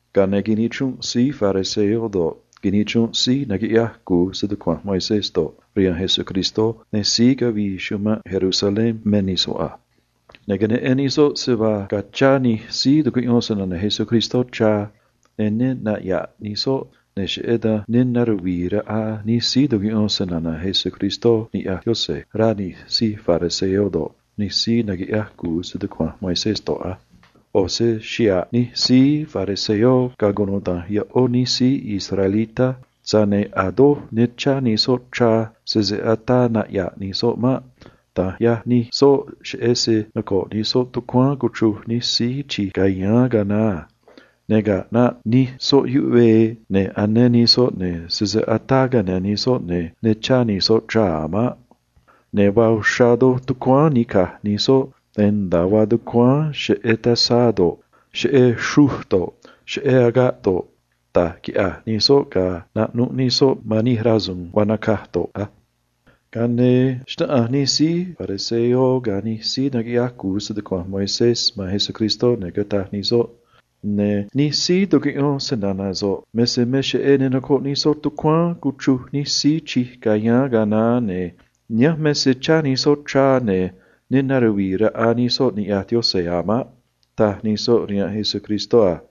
Ga̱a ne̱ nichrunꞌ taꞌa̱j nij síí fariseo do̱ꞌ, nij síí naquiꞌyaj cu̱u stucua̱nj Moisés do̱ꞌ, rihaan Jesús, ne̱ síí cavii chumanꞌ Jerusalén me nij soꞌ a. Ne̱ queneꞌen nij soꞌ se vaa ga̱a chá nij síí tucuꞌyón snana̱ Jesús, ne̱ ne naꞌya̱ꞌ nij soꞌ, ne̱ cheꞌé dan vaa ri̱nꞌ raꞌa nij síí tucuꞌyón snana̱ Jesús niꞌya̱j Yaꞌanj, rá nij síí fariseo ga̱ nij síí naquiꞌyaj cu̱u stucua̱nj Moisés a. ꞌO̱ se xa̱ꞌ nij síí fariseo ga̱ cunuda̱nj ꞌó nij síí israelitá, tza̱j ne̱ a̱ doj ne chá nij soꞌ sese ataa naꞌya̱ꞌ nij soꞌ maꞌ. Da̱nj ꞌyaj nij soꞌ, cheꞌé se ꞌo̱ xraan nocoꞌ nij soꞌ tucuáán cuchruj nij síí uun chij cayáán ga̱a naá a. Ne̱ ga̱a ꞌnaꞌ nique nij soꞌ rihaan yuꞌvee, ne̱ sese ataa cane̱ nij soꞌ, ne̱ ne chá nij soꞌ a̱ maꞌ. Ne̱ vaa uxrá doj tucuáán nica̱j nij soꞌ, ne̱ nda̱a vaa tucuáán cheꞌé tazá do̱ꞌ, cheꞌé xruj do̱ꞌ, cheꞌé agaꞌ do̱ꞌ, da̱j quiꞌya̱j nij soꞌ ga̱a naꞌnuꞌ nij soꞌ man nij rasu̱u̱n vaa nacaj yoꞌ a. Ga̱a ne̱ xnáꞌanj nij síí fariseo ga̱ nij síí naquiꞌyaj cu̱u stucua̱nj Moisés man Jesús a: ―Nij síí tucuꞌyón snana̱ so̱ꞌ me se me cheꞌé ne nocoꞌ nij soꞌ tucuáán cuchruj nij síí uun chij cayáán ga̱a naá, ne̱ nihánj me se chá nij soꞌ, ne̱ ne naruvii raꞌa nij soꞌ niꞌya̱j Yaꞌanj a̱ maꞌ ―taj nij soꞌ a.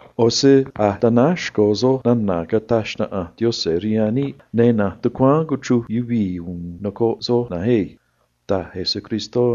ꞌO̱ se a̱j tanáj xco̱ soj suun caꞌneꞌ Yaꞌanj rihaan níꞌ, ne̱ na̱nj tucuáán cuchruj yuvii̱ u̱u̱n nocoꞌ soj na̱nj á ―taj Jesús a.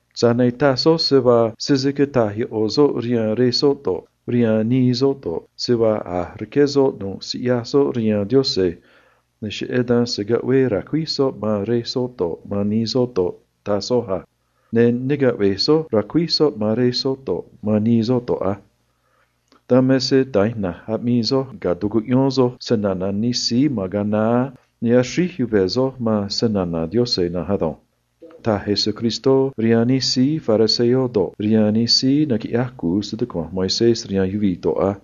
Tza̱j ne̱ taj soj se vaa sese cata̱j ꞌo̱ soꞌ rihaan rej soꞌ do̱ꞌ, rihaan nii soꞌ do̱ꞌ, se vaa a̱j rqué soꞌ nu̱ꞌ siꞌyaj soꞌ rihaan Yaꞌanj ne̱ cheꞌé dan se̱ caꞌvee ra̱cuíj soꞌ man rej soꞌ do̱ꞌ, man nii soꞌ do̱ꞌ, taj soj a. Ne̱ ne caꞌve̱j soj ra̱cuíj soꞌ man rej soꞌ do̱ꞌ, man nii soꞌ do̱ꞌ maꞌ. Dan me se da̱nj ina̱nj aꞌmii soj ga̱a tucuꞌyón soj snana̱ nij síí ma̱n ga̱a naá, ne̱ axríj yuve̱ soj man snana̱ Yaꞌanj na̱nj ado̱nj ―taj Jesús rihaan nij síí fariseo ga̱ nij síí naquiꞌyaj cu̱u stucua̱nj Moisés a.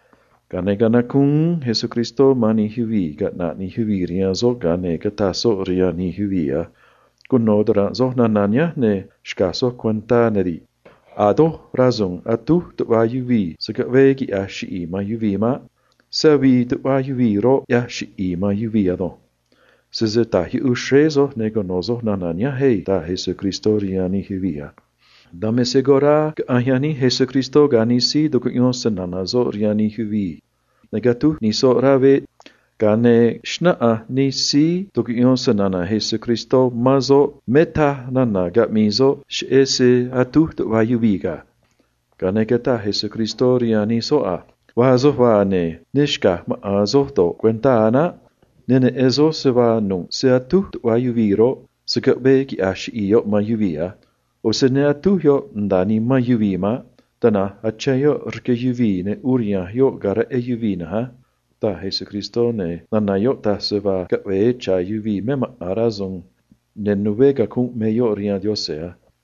Ga̱a ne̱ canacúún uún Jesús man cunuda̱nj nij yuvii̱ caꞌna̱ꞌ nij yuvii̱ rihaan soꞌ, ga̱a ne̱ cataj soꞌ rihaan nij soꞌ a: ―Cuno̱ ta̱ranꞌ soj nana̱ nihánj, ne̱ xca̱j soj cuentá á: A̱ doj rasu̱u̱n atúj tuꞌva yuvii̱ se̱ caꞌvee quiꞌya̱j chiꞌi̱i̱ nimán yuvii̱ maꞌ. Tana̱nj se avii nimán yuvii̱ roꞌ, ꞌyaj chiꞌi̱i̱ nimán yuvii̱ ado̱nj. Sese ta̱j yuꞌuj xréé soj, ne̱ cuno̱ soj nana̱ nihánj á ―taj Jesús a. Dan me se ga̱a caꞌanj yaníj Jesús ga̱ nij síí tucuꞌyón snana̱ soꞌ rihaan nij yuvii̱ ri̱i̱, ne̱ catúj nij soꞌ rá veꞌ, ga̱a ne̱ xnáꞌanj nij soꞌ man soꞌ me se me raj cata̱a nana̱ caꞌmii soꞌ a. Ga̱a ne̱ cataj Jesús rihaan nij soꞌ a: ―Vaa soj vaa, ne̱ ne xca̱j maꞌa̱n soj do̱ꞌ cuentá a̱ naꞌ. Ne̱ ne neꞌen soj se vaa nu̱ꞌ se atúj tuꞌva yuvii̱ roꞌ, se̱ caꞌvee quiꞌya̱j chiꞌi̱i̱ yoꞌ man yuvii̱ a̱ naꞌ. ꞌO̱ se ne atúj yoꞌ nda̱a nimán yuvii̱ maꞌ. Tana̱nj achén yoꞌ rque yuvii̱, ne̱ uriha̱nj yoꞌ ga̱a reꞌé yuvii̱ na̱nj á ―taj Jesús a. Ne̱ nana̱ yoꞌ taj se vaa caꞌve̱e cha̱ yuvii̱ me maꞌa̱n rasu̱u̱n ne̱ né cacunꞌ me yoꞌ rihaan Yaꞌanj maꞌ.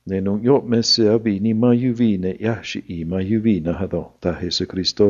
Ne̱ nu̱ꞌ yoꞌ me se avii nimán yuvii̱ ne̱ ꞌyaj chiꞌi̱i̱ man yuvii̱ na̱nj ado̱nj ―taj Jesús a.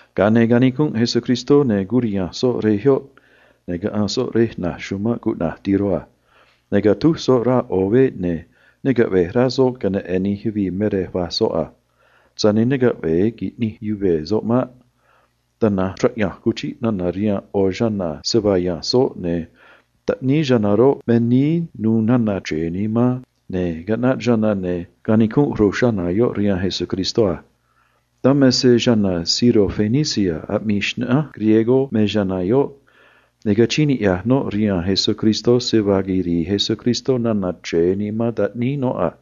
Ga̱a ne̱ naxuma̱a̱n Jesús, ne̱ curiha̱nj soꞌ rej yoꞌ, ne̱ caꞌanj soꞌ rej na̱j chumanꞌ cuꞌna̱j Tiro ga̱ Sidón a. Ne̱ catúj soꞌ rá ꞌo̱ veꞌ, ne̱ ne caꞌve̱j rá soꞌ queneꞌe̱n nij yuvii̱ me rej vaj soꞌ a. Tza̱j ne̱ ne caꞌve̱e qui̱ꞌnij yuve̱ soꞌ maꞌ. Tana̱nj raꞌya̱nj cuchiꞌ nana̱ rihaan ꞌo̱ chana̱ me rej yáán soꞌ, ne̱ taꞌníí chana̱ roꞌ, me níí nu̱u̱ nana̱ chre̱e nimán, ne̱ caꞌnaꞌ chana̱, ne̱ quinij ru̱j chana̱ yoꞌ rihaan Jesús a. Dan me se chana̱ sirofenicia aꞌmii xnaꞌánj griego me chana̱ yoꞌ, ne̱ rquee̱ noꞌ man Jesús se vaa quiri̱i̱ Jesús nana̱ chre̱e nimán taꞌníí noꞌ a.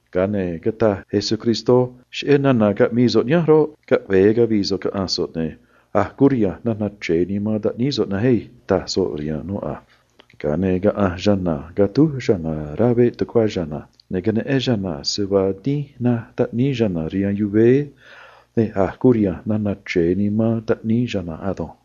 Ga̱a ne̱ cataj Jesús rihaan noꞌ a: ―Cheꞌé nana̱ caꞌmii so̱ꞌ nihánj roꞌ, caꞌve̱e cavi̱i̱ so̱ꞌ caꞌa̱nj so̱ꞌ, ne̱ a̱j curiha̱nj nana̱ chre̱e nimán taꞌníí so̱ꞌ na̱nj á ―taj soꞌ a. Ga̱a ne̱ nucuiꞌ chana̱ tucuá noꞌ, ne̱ queneꞌen noꞌ se vaa dínj naj taꞌníí noꞌ rihaan camá, ne̱ a̱j curiha̱nj nana̱ chre̱e nimán taꞌníí chana̱ ado̱nj.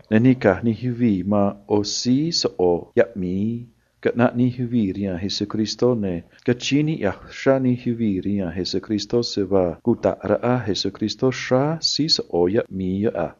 Ne̱ nica̱j nij yuvii̱ man ꞌo̱ síí soꞌo̱ yaꞌmi̱i caꞌnaꞌ nij yuvii̱ rihaan Jesús, ne̱ rquee̱ uxrá nij yuvii̱ rihaan Jesús se vaa cuta̱ꞌ raꞌa Jesús xráá síí soꞌo̱ yaꞌmi̱i yoꞌ a.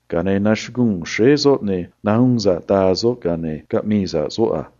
Ga̱a ne̱ nachuguu̱n xréé soꞌ, ne̱ nahuun sa̱ꞌ daa soꞌ, ga̱a ne̱ caꞌmii sa̱ꞌ soꞌ a.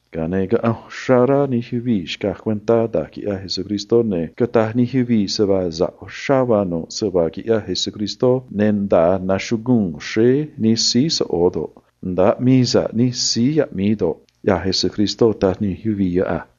Ga̱a ne̱ caꞌanj uxrá rá nij yuvii̱ xcaj cuentá da̱j quiꞌyaj Jesús, ne̱ cataj nij yuvii̱ se vaa sa̱ꞌ uxrá vaa nu̱ꞌ se vaa quiꞌyaj Jesús, ne̱ nda̱a nachuguu̱n xréé nij síí soꞌo̱ do̱ꞌ, nda̱a aꞌmii sa̱ꞌ nij síí yaꞌmi̱i do̱ꞌ, ꞌyaj Jesús, taj nij yuvii̱ yoꞌ a.